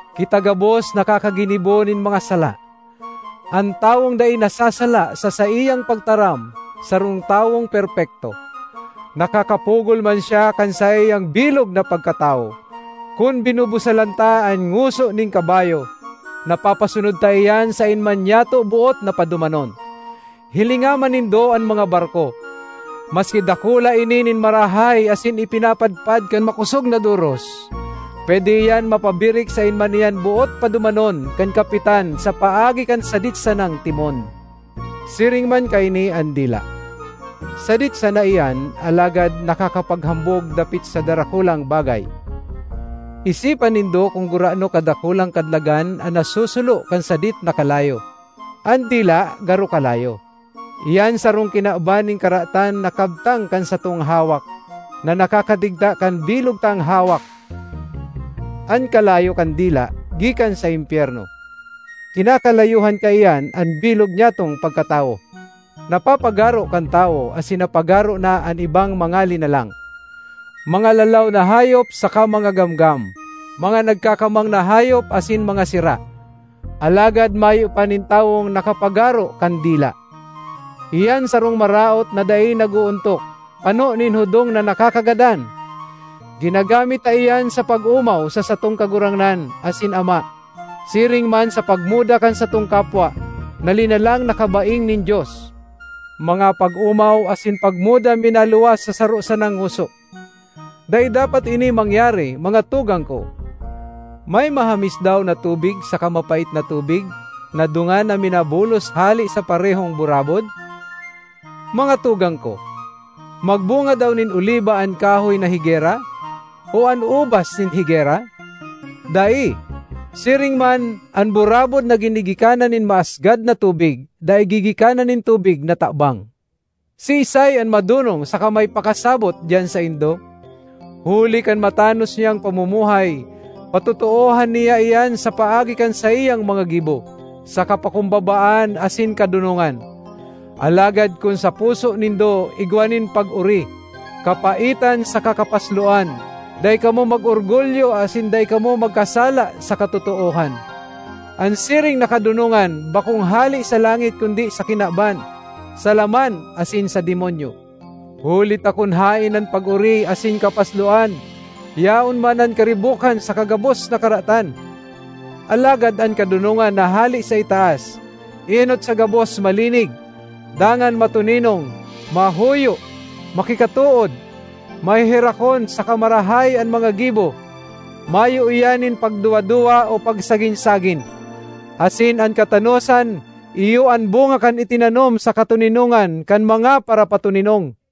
Kita gabos nakakaginibo nin mga sala. An tawong dai nasasala sa saiyang pagtaram sarong tawong perpekto; nakakapugol man siya kan saiyang bilog na pagkatawo. Kun binubusalan ta an ngoso nin kabayo, napapasunod ta iyan saen man nyato boot na padumanon. Hilinga man nindo an mga barko; maski dakula ini nin marahay asin ipinapadpad kan makosog na doros, pwede iyan mapabirik saen man iyan boot padumanon kan kapitan sa paagi kan sadit sanang timon. Siring man kaini an dila: sadit sana iyan alagad nakakapaghambog dapit sa darakulang bagay. Isipa nindo kun gurano kadakulang kadlagan an nasusulo kan sadit na kalayo! An dila garo kalayo. Iyan sarong kinaban nin karatan na kabtang kan satong hawak na nakakadigta kan bilog tang hawak! An kalayo kan dila gikan sa impyerno; kinakalayohan kaiyan an bilog nyatong pagkatawo. Napapagaro kan tawo asin napagaro na an ibang mga linalang—mga lalaw na hayop saka mga gamgam, mga nagkakamang na hayop asin mga sira— alagad mayo pa nin tawong nakapagaro kan dila. Iyan sarong maraot na dai nag-oontok, pano nin hudong na nakakagadan! Ginagamit ta iyan sa pag-omaw sa satong Kagurangnan asin Ama, siring man sa pagmuda kan satong kapwa, na linalang na kabaing nin Dios. Mga pag-omaw asin pagmuda minaluwas sa saro sanang ngoso. Dai dapat ini mangyari, mga tugang ko. May mahamis daw na tubig saka mapait na tubig na dungan na minabulos hale sa parehong burabod? Mga tugang ko, magbunga daw nin oliba an kahoy na higera? O an ubas nin higera? Dai! Siring man, an burabod na ginigikanan nin maasgad na tubig dai gigikanan nin tubig na tabang. Siisay an madonong saka may pakasabot diyan saindo? Huli kan matanos niyang pamumuhay, patotoohan niya iyan sa paagi kan saiyang mga gibo, sa kapakumbabaan asin kadonongan. Alagad kun sa puso nindo igwa nin pag-ori, kapaitan saka kapasloan, dai kamo mag-orgulyo asin dai kamo magkasala sa katotoohan. An siring na kadonongan bakong hale sa langit kundi sa kinaban, sa laman asin sa demonyo. Huli ta kun haen an pag-ori asin kapasloan, yaon man an karibokan saka gabos na karatan. Alagad an kadonongan na hale sa itaas, enot sa gabos malinig, dangan matoninong, mahuyo, makikatood, maheherakon saka marahay an mga gibo; mayo iyan nin pagduwa-duwa o pagsagin-sagin. Asin an katanosan iyo an bunga kan itinanom sa katoninongan kan mga parapatoninong.